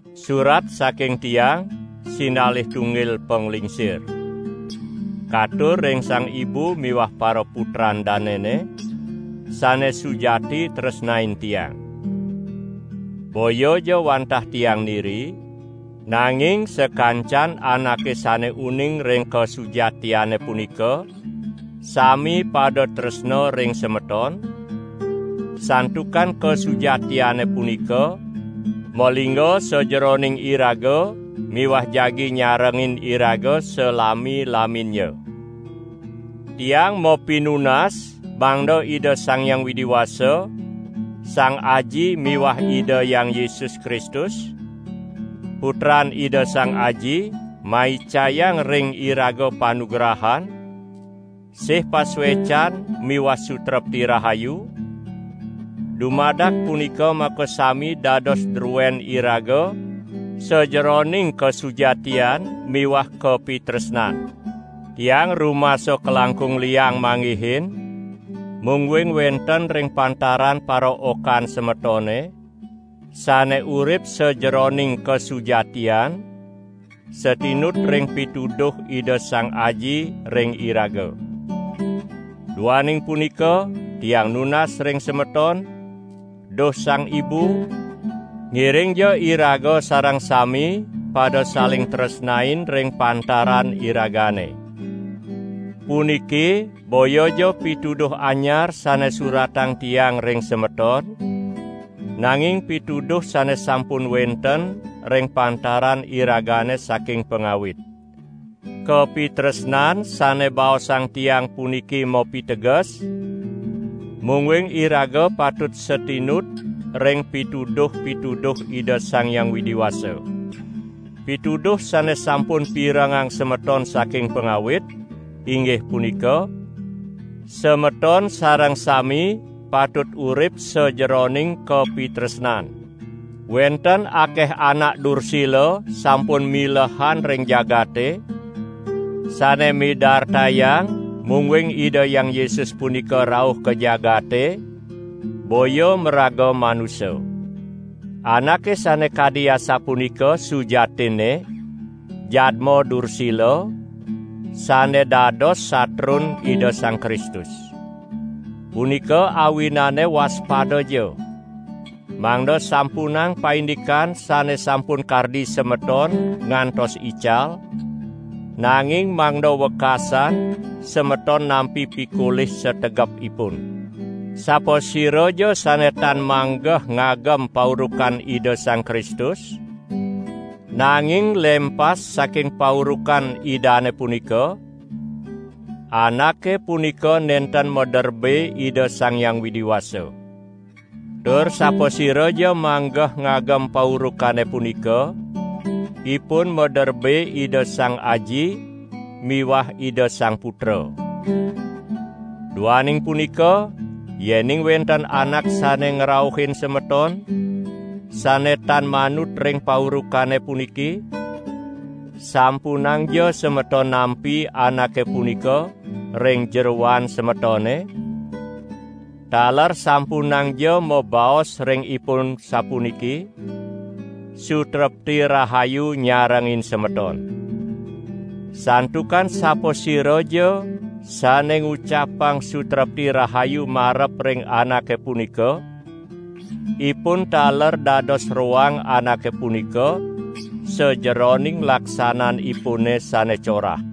Surat saking tiang, sinalih tunggil panglingsir. Katur ring Sang Ibu miwah paraputran danene, sane sujati tresnain tiang. Boyaja wantah tiang niri, nanging sakancan anake sane uning ring kasujatiane punika sami pada tresna ring semeton, santukan kasujatiane punika malingga sajeroning iraga miwah jagi nyarengin iraga salami-laminnya. Tiang mapinunas mangda Ida Sang Hyang Widi Wasa, Sang Aji miwah Ida Hyang Yesus Kristus, Putran Ida Sang Aji, maicayang ring iraga panugrahan, sih pasuecan miwah sutrepti rahayu; dumadak punika makasami dados druen iraga sajeroning kasujatian miwah kapitresnan. Tiang rumasa kalangkung liang manggihin, mungguing wenten ring pantaran paraokan semetone, sane urip sajeroning kasujatian, satinut ring pituduh Ida Sang Aji ring iraga. Duaning punika tiang nunas ring semeton, duh Sang Ibu, ngiringja iraga sareng sami pada saling tresnain ring pantaran iragane. Puniki boyaja pituduh anyar sane suratang tiang ring semeton, nanging pituduh sane sampun wenten ring pantaran iragane saking pangawit. Kapitresnan sane baosang tiang puniki mapiteges, mungguing iraga patut satinut ring pituduh-pituduh Ida Sang Hyang Widi Wasa. Pituduh sane sampun pirengang semeton saking pangawit; inggih punika: semeton sareng sami patut urip sajeroning kapitresnan. Wenten akeh anak dursila sampun milehan ring jagate, sane midartayang mungguing Ida Hyang Yesus punika rauh ka jagate boya maraga manusa. Anake sane kadi asapunika sujatinne, jadma dursila, sane dados satrun Ida Sang Kristus. Punika awinane waspadaja, mangda sampunang paindikan sane sampun kardi semeton ngantos ical, nanging mangda wekasan semeton nampi pikolih sategepipun. Sapasiraja sane tan manggeh ngagem paurukan Ida Sang Kristus, nanging lempas saking paurukan Idane punika, anake punika nenten maderbe Ida Sang Hyang Widi Wasa. Tur sapasiraja manggeh ngagem paurukane punika, ipun maderbe Ida Sang Aji miwah Ida Sang Putra. Duaning punika yening wenten anak sane ngrauhin semeton, sane tan manut ring paurukane puniki, sampunangja semeton nampi anake punika ring jeroan semetone; taler sampunangja mabaos ring ipun sapuniki: "Sutrepti rahayu nyarengin semeton." Santukan sapasiraja sane ngucapang sutrepti rahayu marep ring anake punika, ipun taler dados roang anake punika sajeroning laksananipune sane corah.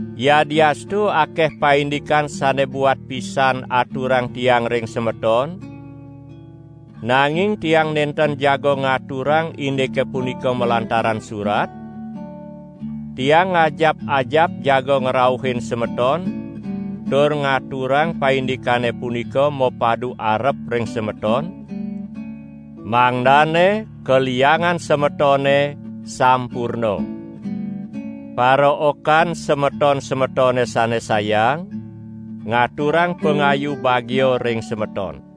Yadiastu akeh paindikan sane buat pisan aturang tiang ring semeton, nanging tiang nenten jaga ngaturang indike punika malantaran surat; tiang ngajap-ajap jaga ngrauhin semeton tur ngaturang paindikane punika mapadu arep ring semeton, mangdane kaliangan semetone sampurna. Paraokan semeton-semetone sane sayang, ngaturang pangayu bagia ring semeton.